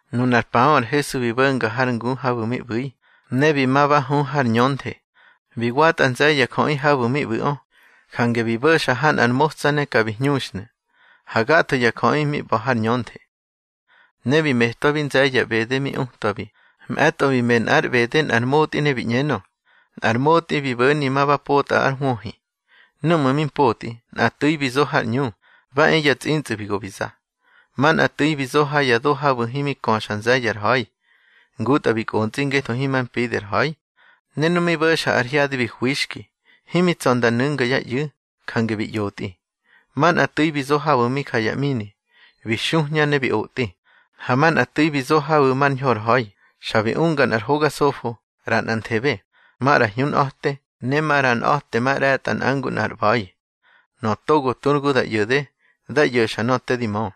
Nunar paꞌö ar Hesu bi bo̱nga har ngu habu̱ mi ꞌbu̱i, ne bi ma ba hu har ñönthe. Bi watꞌa nze̱ye̱ ya jöꞌi habu̱ mi ꞌbu̱ꞌö, jange bi bo̱xa ha nꞌar motsa ne ka bi hñuxnu̱, ha gatho ya jöꞌi mi ꞌba̱ har ñönthe. Ne bi metwabi nze̱ye̱ ya ꞌbede mi utwabi. Mꞌe̱tꞌo bi me nꞌár ꞌbede nꞌar motꞌi ne bi ꞌñenö: —Nꞌar motꞌi bi bo̱ni ma ba potꞌa ár hwöhi. Núꞌmu̱ mi mpotꞌi, nꞌa tu̱i bi zo har ꞌñu, ba e ya tsꞌintsꞌu̱ bi go bi za. Manꞌa tu̱i bi zo ha ya do habu̱ himi köxa nze̱ye̱ ar ha̱i. Ngutꞌa bi kꞌontsꞌi ngetho himar mpidi ar ha̱i. Ne nu mi bo̱xa ar hyadi bi hwixki. Himi tsa̱ nda nu̱nga yá ꞌyu̱, jange bi ꞌyotꞌi. Manꞌa tu̱i bi zo habu̱ mi ja ya ꞌmini, bi xuhña ne bi otꞌi. Ha manꞌa tu̱i bi zo habu̱ mar ñho ar ha̱i, xa bi unga nꞌar hoga sofo, ꞌra nꞌa nthehe, maꞌra hñunꞌa̱te, ne maꞌra nꞌa̱temaꞌre̱tꞌa nꞌa ngu nꞌar ꞌba̱i. Nöꞌö togo tu ar gu da ꞌyo̱de, dá ꞌyo̱xa nöꞌö te di mö.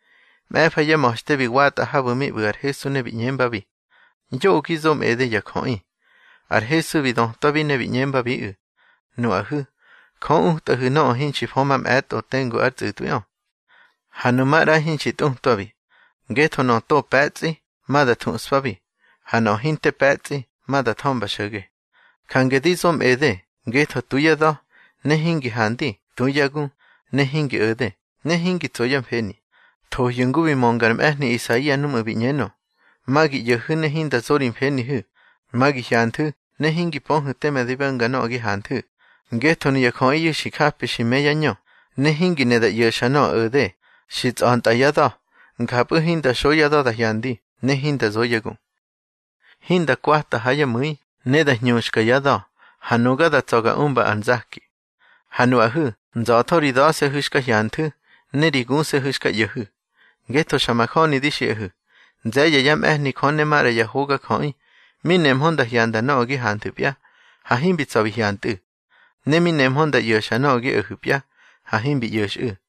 Mꞌe̱fa yá ma̱xte bi watꞌa habu̱ mi ꞌbu̱ ar Hesu ne bi ꞌñembabi: —Yoꞌö gi zo mꞌede ya jöꞌi. Ar Hesu bi dötwabi ne bi ꞌñembabiꞌu̱: —Nuꞌahu̱, Jö utꞌahu̱ nöꞌö hinxki fö mamꞌe̱tꞌo tengu ár tsꞌu̱tꞌwi, ha nu maꞌra hinxi tꞌutwabi. Ngetho nöꞌö to pe̱tsꞌi, ma da thuꞌspabi, ha nöꞌö hinte pe̱tsꞌi, ma da thömba xo̱ge. Jange di zo mꞌede, ngetho tu yá da̱, ne hingi handi, tu yá gu, ne hingi o̱de, ne hingi tso yá mfeni. Thohyu̱ ngu bi mönga ar mꞌe̱hni Isaia núꞌmu̱ bi ꞌñenö: Ma gi ꞌyo̱hu̱, ne hinda zo ri mfenihu̱. Ma gi hyanthu̱, ne hingi pöhu̱ teme di bo̱nga nöꞌö gi hanthu̱. Ngetho nuya jöꞌiyu̱ xi japi xi më yá ñö, ne hingi ne da ꞌyo̱xa nöꞌö o̱de. Xi tsꞌa̱ntꞌa yá da̱, njapꞌu̱ hinda xo yá da̱ da hyandi, ne hinda zo yá gu, hinda kwata ha yá mu̱i, ne da hñuxka yá da̱, ha nuga da tsa̱ ga umba ar nzaki. Ha nuꞌahu̱, nza̱tho ri da̱se̱hu̱ xka hyanthu̱, ne ri guse̱hu̱ xka ꞌyo̱hu̱. Ngetho xa majöni di xiꞌahu̱, nze̱ye̱ yá mꞌe̱hni Jö ne maꞌra ya hogajöꞌi, mi nemhö nda hyanda nöꞌö gi hanthu̱pya, ha himbi tsa̱ bi hyantꞌu̱. Ne mi nemhö nda ꞌyo̱xa nöꞌö gi o̱hu̱pya, ha himbi ꞌyo̱xꞌu̱.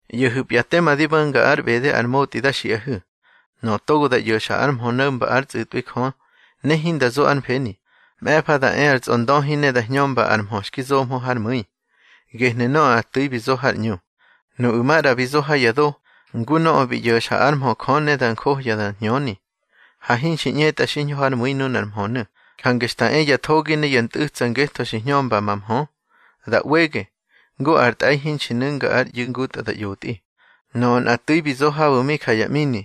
ꞌYo̱hu̱pya tema di bo̱nga ár ꞌbede ar motꞌi da xiꞌahu̱. Nöꞌö togo da ꞌyo̱xa ar mhö no̱mba ár tsꞌu̱tꞌwi Jö ne hinda zo ár mfeni, mꞌe̱fa da e ar tsꞌondöhi ne da hñömba ar mhö xki zomhö hár mu̱i, gehnu̱ nöꞌö nꞌa tu̱i bi zo har ꞌñu. Nuꞌu̱ maꞌra bi zo ha ya do, ngu nöꞌö bi ꞌyo̱xa ár mhö Jö ne da njohya da hñöni. Ha hinxi ꞌñetꞌa xiñho hár mu̱i nunar mhönu̱, jange xta e ya thogi ne ya ntꞌu̱tsa ngetho xi hñömga ma mhö, da ꞌwege, ngu ar tꞌe̱i hinxi nu̱nga ár ꞌyu̱ ngutꞌa da ꞌyotꞌi. Nöꞌö nꞌa tu̱i bi zo habu̱ mi ja ya ꞌmini,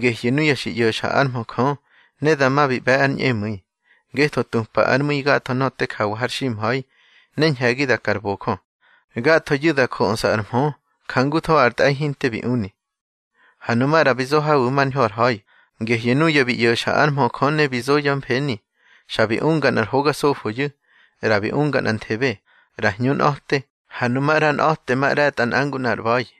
gehyu̱ nuya xi ꞌyo̱xa ár mhö Jö, ne dama bi ꞌbe̱ ar ñꞌemu̱i, ngetho tupa ár mu̱i gatho nöꞌö te jawa har ximha̱i, ne ñhe̱gi da ka ar bojö. Gathoyu̱ da jöꞌsa ar mhö, jangutho ar tꞌe̱i hinte bi uni. Ha nu maꞌra bi zo habu̱ mar ñho ar ha̱i, gehyu̱ nuya bi ꞌyo̱xa ár mhö Jö ne bi zo yá mfeni. Xa bi unga nꞌar hoga zofoyu̱, ꞌra bi unga nꞌanthebe, ꞌra hñunꞌa̱te, ha nu maꞌra nꞌa̱temaꞌre̱tꞌa nꞌa ngu nꞌar ꞌba̱i.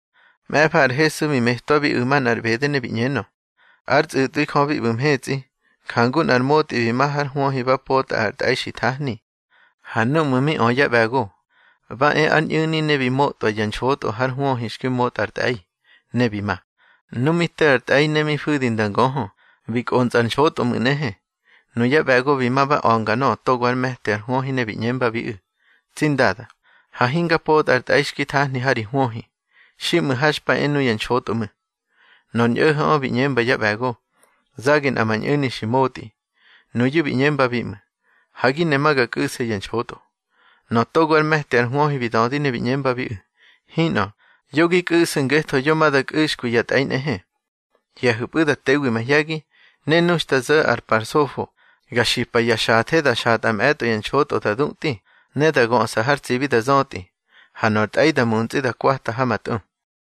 Mꞌe̱fa ar Hesu bi metwabiꞌu̱ manꞌar ꞌbede ne bi ꞌñenö: —Ár tsꞌu̱tꞌwi Jö bi ꞌbu̱ mhetsꞌi jangu nꞌar motꞌi bi ma hár hwöhi ba potꞌa ar tꞌe̱i xi thahni. Ha núꞌmu̱ mi ö yá ꞌbe̱go, ba e ár ñꞌu̱ni ne bi motꞌwa ya nxotꞌo hár hwöhi xki motꞌa ar tꞌe̱i, ne bi ma. Nu mi te ar tꞌe̱i ne mi fu̱di nda ngöhö, bi kꞌontsꞌa ar nxotꞌo ꞌmu̱ nꞌehe. Nuya ꞌbe̱go bi ma ba a̱nga nöꞌö togo ár me̱ti ar hwöhi ne bi ꞌñembabiꞌu̱: Tsi ndada, ha hinga potꞌa ar tꞌe̱i xki nthahni ha ri hwöhi. Xiꞌmu̱ ha xpa e nuya nxotꞌo ꞌmu̱. Nor ñꞌo̱ho̱ꞌö bi ꞌñemba yá ꞌbe̱go: Zage nꞌa ma ñꞌu̱ni xi motꞌi. Nuyu̱ bi ꞌñembabi ꞌmu̱: Ha gi ne ma ga kꞌu̱se ya nxotꞌo. Nöꞌö togo ár me̱ti ar hwöhi bi dödi ne bi ꞌñembabiꞌu̱: Hinꞌö, yo gi kꞌu̱su̱ ngetho yo ma da kꞌu̱xkwi ya tꞌe̱i nꞌehe. Hye̱hu̱pꞌu̱ da tewi mahye̱gi, ne nu xta zo̱ ár pa ar sofo, ga xipa ya xathe da xatꞌa mꞌe̱tꞌo ya nxotꞌo da dutꞌi, ne da göꞌsa har tsibi da zötꞌi. Ha nor tꞌe̱i da muntsꞌi da kwata ha ma tꞌu.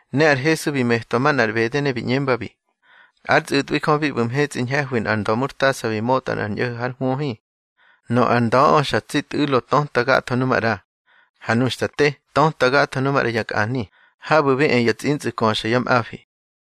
Ne ar Hesu bi metwa manꞌar ꞌbede ne bi ꞌñembabi: —Ár tsꞌu̱tꞌwi Jö bi ꞌbu̱ mhetsꞌi ñhe̱hwi nꞌar nda̱murtasa bi motꞌa nꞌar ñꞌo̱ho̱ hár hwöhi. Nöꞌö ar nda̱ꞌö xa tsi tꞌu̱lo töta gatho nu maꞌra. Ha nu xta te, töta gatho nu maꞌra ya kꞌani, habu̱ bi e ya tsꞌintsꞌu̱ köxa yá mꞌafi.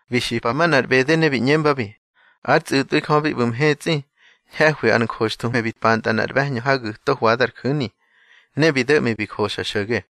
Bi xipa manꞌar ꞌbede ne bi ꞌñembabi: —Ár tsꞌu̱tꞌwi Jö bi ꞌbu̱ mhetsꞌi ñhe̱hwi ar njoxthuhme bi pantꞌa nꞌar ꞌbe̱hñö ha gu̱to hwada ar ju̱ni, ne bi do̱ꞌmi bi joxa xo̱ge.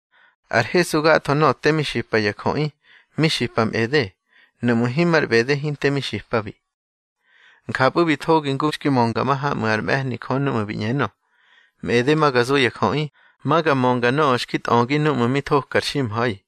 Ar Hesu gatho nöꞌö te mi xipa ya jöꞌi, mi xipa mꞌede. Nuꞌmu̱ himar ꞌbede hinte mi xipabi. Njapꞌu̱ bi thogi ngu xki mönga mahamꞌu̱ ár mꞌe̱hni Jö núꞌmu̱ bi ꞌñenö: Mꞌede ma ga zo ya jöꞌi, Ma ga mönga nöꞌö xki tꞌögi núꞌmu̱ mi thoka ar ximha̱i.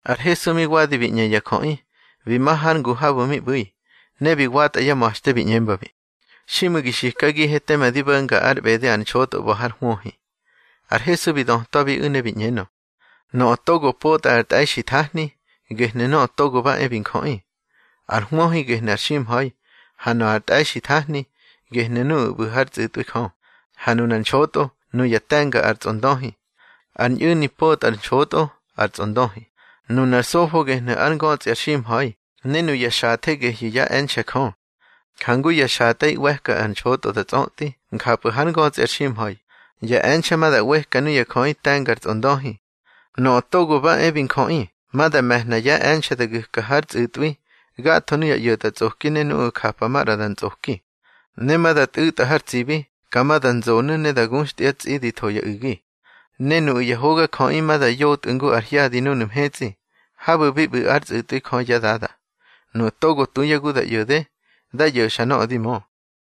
Ar Hesu mi wadi bi ꞌñe ya jöꞌi, bi ma har ngu habu̱ mi ꞌbu̱i, ne bi watꞌa yá ma̱xte, bi ꞌñembabi: —Xiꞌmu̱ gi xikagihe teme di bo̱nga ár ꞌbede ar nxotꞌo ꞌba̱ har hwöhi. Ar Hesu bi dötwabiꞌu̱ ne bi ꞌñenö: —Nöꞌö togo potꞌa ar tꞌe̱i xi thahni, gehnu̱ Nöꞌö Togo ba e bi Njöꞌi. Ar hwöhi gehnu̱ ar ximha̱i, ha nöꞌö ar tꞌe̱i xi thahni, gehyu̱ nuꞌu̱ ꞌbu̱ hár tsꞌu̱tꞌwi Jö. Ha nunar nxotꞌo, nuya te̱nga ar tsꞌondöhi. Ar ñꞌu̱ni potꞌa ar nxotꞌo, ar tsꞌondöhi. Nunar sofo gehnu̱ ár ngötsꞌi ar ximha̱i, ne nuya xathe gehyu̱ yá e̱nxe̱ Jö. Jangu ya xatꞌe̱i ꞌweka ar nxotꞌo da tsꞌötꞌi, njapꞌu̱ hár ngötsꞌi ar ximha̱i, ya e̱nxe̱ ma da ꞌweka nuya jöꞌi te̱nga ar tsꞌondöhi. Nöꞌö Togo ba e bi Njöꞌi ma da me̱hna yá e̱nxe̱ da gu̱ka hár tsꞌu̱tꞌwi gatho nuya ꞌyo̱tꞌatsꞌoki ne nuꞌu̱ japa maꞌra da ntsꞌoki. Ne ma da tꞌu̱tꞌa har tsibi, ka ma da nzonu̱ ne da guxtya tsꞌi di tho ya u̱gi. Ne nuꞌu̱ ya hogajöꞌi ma da yotꞌu̱ ngu ar hyadi núnu̱ mhetsꞌi, habu̱ bi ꞌbu̱ ár tsꞌu̱tꞌwi Jö yá Dada. Nuꞌu̱ togo tu yá gu da ꞌyo̱de, dá ꞌyo̱xa nöꞌö di mö.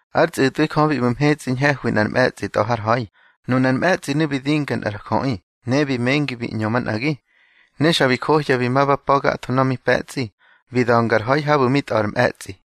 Ár tsꞌu̱tꞌwi Jö bi ꞌbu̱ mhetsꞌi ñhe̱hwi nꞌar mꞌe̱tsꞌi tꞌa̱ har ha̱i. Nunar mꞌe̱tsꞌinu̱ bi dinga nꞌar jöꞌi, ne bi mengi bi ꞌñö manꞌagi. Ne xa bi njohya bi ma ba pa̱ gatho nöꞌö mi pe̱tsꞌi, bi da̱nga ar ha̱i habu̱ mi tꞌa̱ ar mꞌe̱tsꞌi.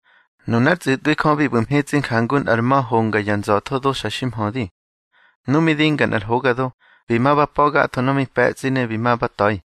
Nunár tsꞌu̱tꞌwi Jö bi ꞌbu̱ mhetsꞌi jangu nꞌar ma̱ honga ya nza̱tho do xa xi mhödi. Nu mi dinga nꞌar hoga do, bi ma ba pa̱ gatho nöꞌö mi pe̱tsꞌi ne bi ma ba ta̱i.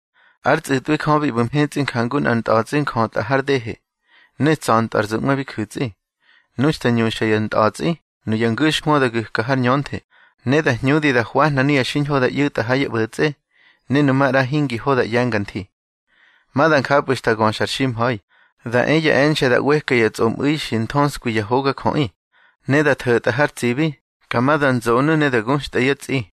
Ár tsꞌu̱tꞌwi Jö bi ꞌbu̱ mhetsꞌi jangu nꞌar ntꞌa̱tsꞌi njötꞌa har dehe ne tsa̱ntꞌö ar zuꞌwe bi gu̱tsꞌi. Nu xta ñuxa yá ntꞌa̱tsꞌi, nuya ngu̱xhwö da gu̱ka har ñönthe, ne da hñudi da hwahna nuya xiñho da ꞌyu̱tꞌa ha yá ꞌbo̱tsꞌe, ne nu maꞌra hingi ho da ꞌye̱nga nthi. Ma da njapꞌu̱ xta göxa ar ximha̱i, da e ya e̱nxe̱ da ꞌweka ya tsꞌomꞌu̱i xi nthöskwi ya hogajöꞌi. Ne da tho̱tꞌa har tsibi, ka ma da nzonu̱ ne da guxtꞌa yá tsꞌi.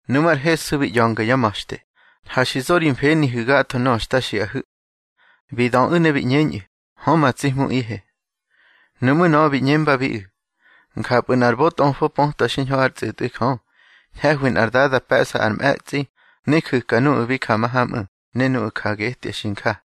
Nuꞌmú̱ ar Hesu bi ꞌya̱nga yá ma̱xte: —Ha xi zo ri mfenihu̱ gatho nöꞌö xta xiꞌahu̱. Bi döꞌu̱ ne bi ꞌñeñꞌu̱: —Hö, ma tsi Hmuꞌihe. Nuꞌmu̱ nöꞌö bi ꞌñembabiꞌu̱: —Njapꞌu̱ nꞌar bötꞌofo pötwa xiñho ár tsꞌu̱tꞌwi Jö, ñhe̱hwi nꞌar dada pe̱ꞌsa ár mꞌe̱tsꞌi, ne ju̱ka nuꞌu̱ mi ja mahamꞌu̱ ne nuꞌu̱ ja getya xi nja.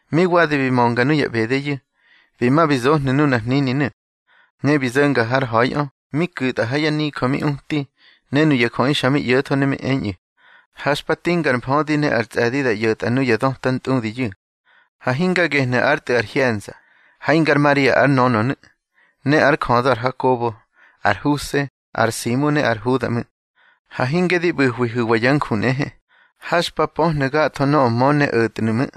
Mi wadi bi mönga nuya ꞌbedeyu̱, bi ma bi zohnu̱ nunar hnininu̱. Ne bi zo̱nga hár ha̱iꞌö, mi ku̱tꞌa ha yá nijö mi uti, ne nuya jöꞌi xa mi ꞌyo̱tho ne mi eñꞌu̱: —Ha xpa tinga ar mfödi ne ar tsꞌe̱di da ꞌyo̱tꞌa nuya döta ntꞌudiyu̱. Ha hinga gehnu̱ ár tꞌu̱ ar hye̱nza. Ha hingar Maria ár nönönu̱, ne ár jödö ar Hakobo, ar Huse, ar Simu ne ar Huda ꞌmu̱. Ha hinge di ꞌbu̱hwihu̱wa yá nju nꞌehe. Ha xpa pöhnu̱ gatho nöꞌö mö ne o̱tnu̱ ꞌmu̱.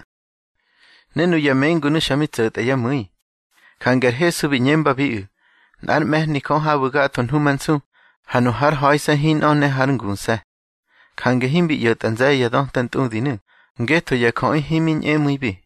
Ne nuya mengunu̱ xa mi tso̱tꞌa yá mu̱i, jange ar Hesu bi ꞌñembabiꞌu̱: —Nꞌár mꞌe̱hni Jö habu̱ gatho hnumansu, ha nu hár ha̱ise̱ hinꞌö, ne hár nguse̱. Jange himbi ꞌyo̱tꞌa nze̱ye̱ ya döta ntꞌudinu̱, ngetho ya jöꞌi himi ñꞌemu̱ibi.